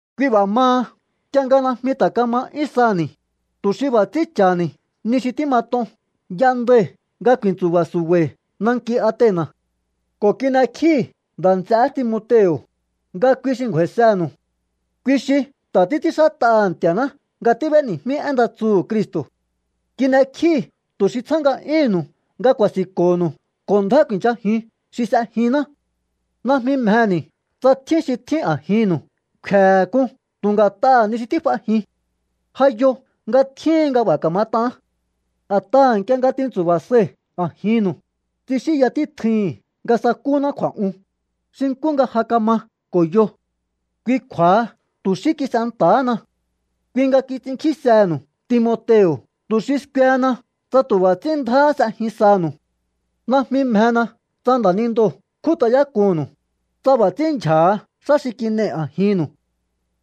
Kui b'a̱ maha nk'ie nga najmi ta̱ kama 'yún saha̱ni̱, tu̱ xi b'a̱ ts'ín cha̱ha̱ni̱ ni xi tímat'on y'endai̱ nga ku̱i̱ntsu̱ba̱ su̱ba̱i̱ nanki Atena̱ ko̱ kin'ekjíi̱ nda̱ nts'eé Timoteo̱, nga kui xi ngju̱a̱i̱senu̱u. Kui xi ta̱ títs'ínxát'aha̱ Nti̱a̱ná nga tíb'éni̱jmí én nda tsuhu̱ Cristo̱. Kin'ekjíi̱ tu̱ xi tsjá nga'yúhu̱nnu̱u nga ku̱a̱si̱nko̱ho̱nu̱u ko̱ ndjá ku̱i̱nchajiun xi s'ejinná. Najmi mjeni̱ tsa tjín xi tjín a̱jinnu̱u kfe̱he̱ k'un tu̱ nga̱t'aha̱ ni xi tíf'ajin. Ja yo nga tjíhin nga b'a̱ ka̱mat'aán. A̱t'aha̱ nk'ie nga tintsu̱ba̱ sai̱ a̱jinnu̱u, tsixínya títjui̱hi̱n nga sa̱kúná kju̱a̱'un, xi nkú nga ja kama ko̱ yo. Kui kju̱a̱ha tu̱ xí kis'enta̱hána. Kui nga kits'inkjísehe̱nu̱u Timoteo̱ tu̱ xi skuehena tsa tu̱ b'a̱ ts'ín ndjáhá s'ejin sanu̱u. Najmi mjena tsa nda̱nindoo̱ kjút'ayák'unnu̱u, tsa b'a̱ ts'ínndyja̱ha xá xi kin'ei̱ a̱jinnu̱u.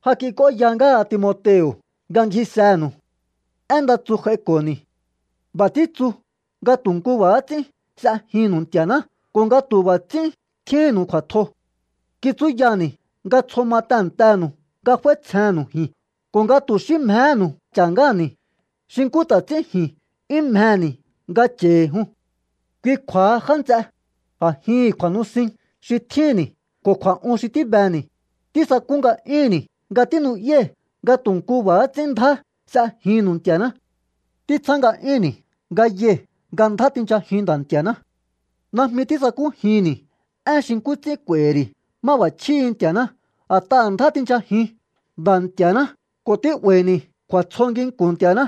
Ja kik'óya ngáha Timoteo̱ nga ngjisenu̱u. Én nda tsu j'aiko̱ni̱. B'a̱ títsu nga tu̱ nkú b'a̱há ts'ín s'ejinnu̱u Nti̱a̱ná ko̱ nga tu̱ b'a̱ ts'ín tjíhínnu̱u kju̱a̱tjo. Kitsúyani̱ nga tsjo ma tehe̱ntenu̱u nga f'áítsjennu̱u ji̱n ko̱ nga tu̱ xí mjehénu̱u cha̱ ngáha̱ni̱ xi nkú ta̱ ts'ín ji̱n 'yún mjeni̱ nga cha̱i̱hi̱ jun. Kui kju̱a̱ha, já nts'e, a̱jihi̱n kju̱a̱nusin xi tjínni̱ ko̱ kju̱a̱'un xi tíbeni̱, tísakú nga'yúnni̱ nga tínu'yái̱ nga tu̱ nku b'a̱há ts'ín ndjá s'ejinnu̱u Nti̱a̱ná. Títsjá nga'yúnni̱ nga yai̱ nga ndjá tinchajiun Nda̱ Nti̱a̱ná. Najmi tísakújinni̱ én xi nkú ts'ín k'u̱a̱i̱hi̱ ri̱ máb'a̱chjíhi̱ Nti̱a̱ná a̱t'aha̱ ndjá tinchajihu̱un Nda̱ Nti̱a̱ná ko̱ tí'ba̱i̱ni̱ kju̱a̱tsjo nginku̱n Nti̱a̱ná.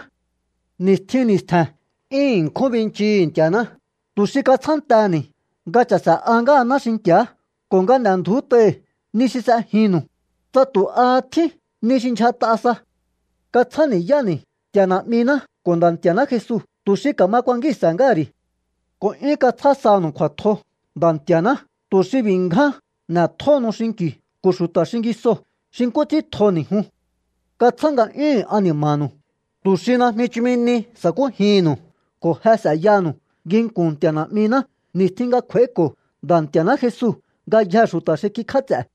Ni̱stjin ni̱stje̱n 'yún ṉkjún binchii̱hi̱ Nti̱a̱ná tu̱ xi katsjántehe̱ni̱ nga cha̱se̱'a ngáhaná xinki̱á ko̱ nga n'e̱ndju̱út'ai̱ ni xi s'ejinnu̱u, tsa tu̱ aha tjín ni xi ndyjat'a sa. Katsjáni̱yáni̱ Nti̱a̱ Na̱'miná ko̱ Nda̱ Nti̱a̱ná Jesu tu̱ xi ka̱ma kuankíhi̱nse̱ ngáha̱ ri̱. Ko̱ 'yún katsjá sanu̱u kju̱a̱tjo Nda̱ Nti̱a̱ná tu̱ xi b'i̱ ngján n'etjóhonu xinki̱u ko̱ xu̱ta̱ xingisoo̱ xi nkú ts'ín tjoni̱ jun. Katsjá nga'yúhu̱n ani̱ma̱nu̱u tu̱ xi najmi chumi ni sa̱kújihi̱nnu̱u ko̱ je s'e̱yaha̱nu̱u nginku̱n Nti̱a̱ Na̱'miná ni̱stjin nga kj'u̱a̱íko̱ Nda̱ Nti̱a̱ná Jesu ngayjee̱ xu̱ta̱ xi kikj'áts'e̱.